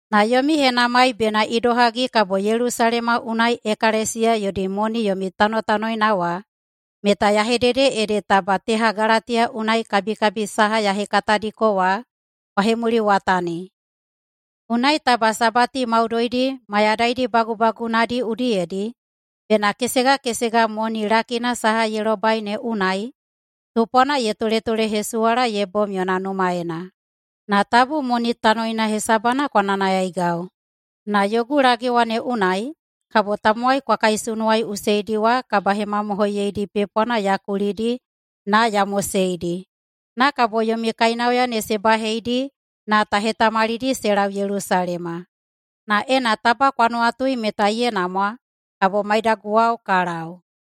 Na yomi henamai bena idohagi kabo Yelusalema unai ekalesiya yodi moni yomi tanotanoina wa meta ya hedede ede taba teha Galatiya unai kabikabi saha ya hekatadiko wa kwa hemuliwatani. Unai taba sabati maudoidi mayadaidi bagubagunadi udiyedi bena kesegakesega moni lakina saha ye lobai ne unai tupwana ye toletolehesuwala ye bom yona numaena. Na tabu moni tanoina hesabana kwa nayanayaigau. Na yogu lagewa ne unai kabo tamowai kwa kaisunuwaiꞌuseidi wa kabahemamohoiyeidi pepwana ya kulidi na ya moseidi, na kabo yomi kainauya ne se baheidi na ta hetamalidi se lau Yelusalema. Na ena taba kwa nuwatui meta ye namwa, kabo maidaguwao ka lau.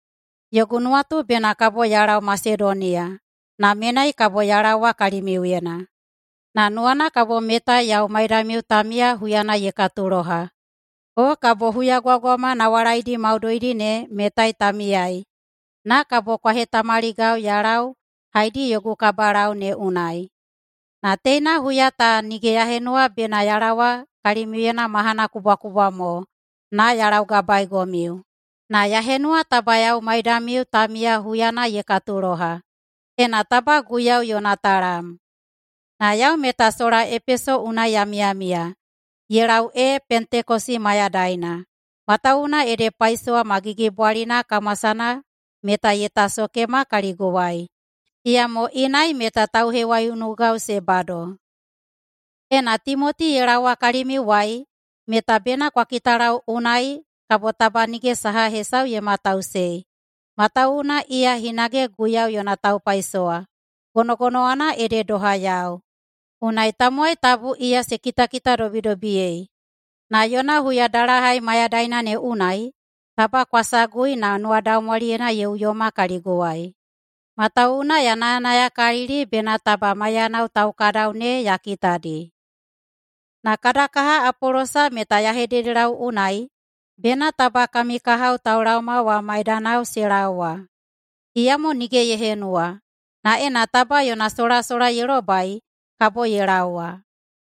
Yogu nuwatu bena kabo ya lau Masedoniya na menai kabo ya laowa kalimiuyena. Na nuwana kabo metai yau maidamiu ta miya huyana ye katuloha, o kabo huyagwagwama nawalaidi maudoidi ne metai ta miyai, na kabo kwa hetamaligau ya lau haedi yogu kabalau ne unai. Na teina huya ta nige ya henuwa bena ya laowa kalimiuyena mahana kubwakubwa mo na ya laugabaeigomiu, na ya henuwa taba yau maidamiu ta miya huyana ye katuloha, ena taba Guiyau yona talam. Na yau meta sola kabo Epeso unai ya miyamiya ye lau ee Pentekosi mayadaina, matawuwuna ede paisowa ma gigibwalina kamwasana meta ye tasokema kaliguwai. Iyamo inai meta tauhewaiunugau se bado. Ena Timoti ye laowa kalimiuwai meta bena kwa kitalau unai kabo taba nige saha hesau ye matausei. Matawuwuna iya hinage Guiyau yona taupaisowa, gonogonowana ede doha yau. Unai tamowai tabu iya se kitakitadobidobiyei. Na yona huyadalahai mayadaina ne unai taba kwa sagui na nuwadaumwaliyena ye uyoma kaliguwai. Matawuwuna ya nayanayakalili bena taba maiyanao taukadau ne ya kitadi. Na kada kaha Apolosa meta ya hededelau unai bena taba kami kahao taulaoma wa maidanao se laowa, iyamo nige ye henuwa. Na ena taba yona solasola ye lobai, kabo ye laowa.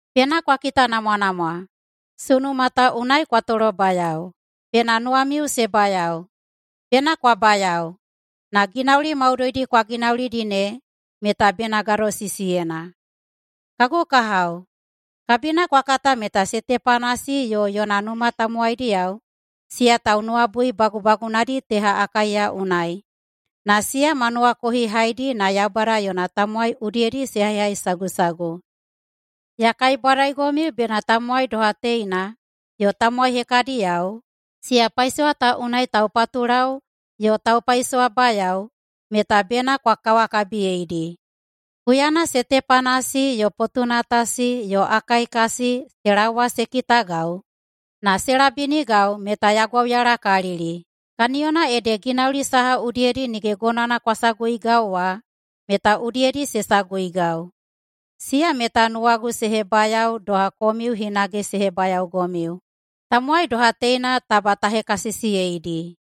Bena kwa kitanamwanamwa. Sunuma ta unai kwa tolobayao. Bena nuwamiu se bayao! Bena kwa bayao! Na ginauli maudoidi kwa ginaulidi ne meta bena gadosisiyena. Kagu kahao, kabina kwa kata meta Setepanasi yo yona numa tamowaidiyao siya taunuwabui bagubagunadi teha Akaiya unai, na siya ma nuwakohihaidi na Yaubada yona tamowai udiyedi se haihaisagusagu. Ya kaibwadaigomiu meta tamowai doha teina, yo tamowai hekadiyao, siya paisowa ta unai taupatulau yo taupaisowabayao, meta bena kwa kawakabiyeidi. Huyana Setepanasi yo Potunatasi yo Akaikasi se laoma se kitagau na se labinigau meta ya gwauyalakalili. Kaniyona ede ginauli saha udiyedi nige gonowana kwa saguigau wa meta udiyedi se saguigau. Siya meta nuwagu se hebayao doha komiu hinage se hebayaogomiu. Tamowai doha teina taba ta hekasisiyeidi.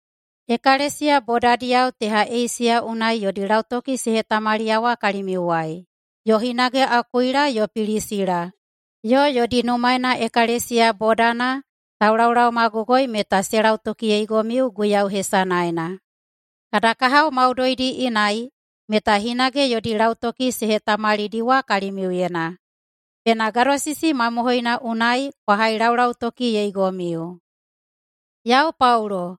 Ekalesiya bodadiyao teha Eisiya unai yodi lautoki se hetamaliyawa kalimiuwai, yo hinage Akuila yo Pilisila yo yodi numaena ekalesiya bodana taulaolaomagogoi meta se lautokiyeigomiu Guiyau hesanaena. Kada kahao maudoidi inai meta hinage yodi lautoki se hetamalidiwa kalimiuyena. Bena gadosisi mamohoina unai kwa hailaulautokiyeigomiu. Yau Paulo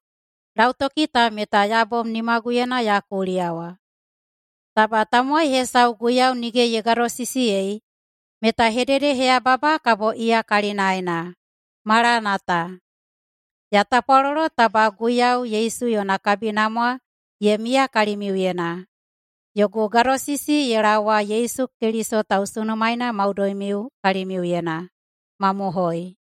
lautoki ta meta ya bom nimaguyena ya kuliyawa. Taba tamowai hesau Guiyau nige ye gadosisiyei meta hededeheyababa kabo iya kalinaena. Malanata! Ya tapwalolo taba Guiyau Yesu yona kabinamwa ye miya kalimiuyena. Yogu gadosisi ye laowa Yesu Keliso tausunumaeina maudoimiu kalimiuyena. Mamohoi.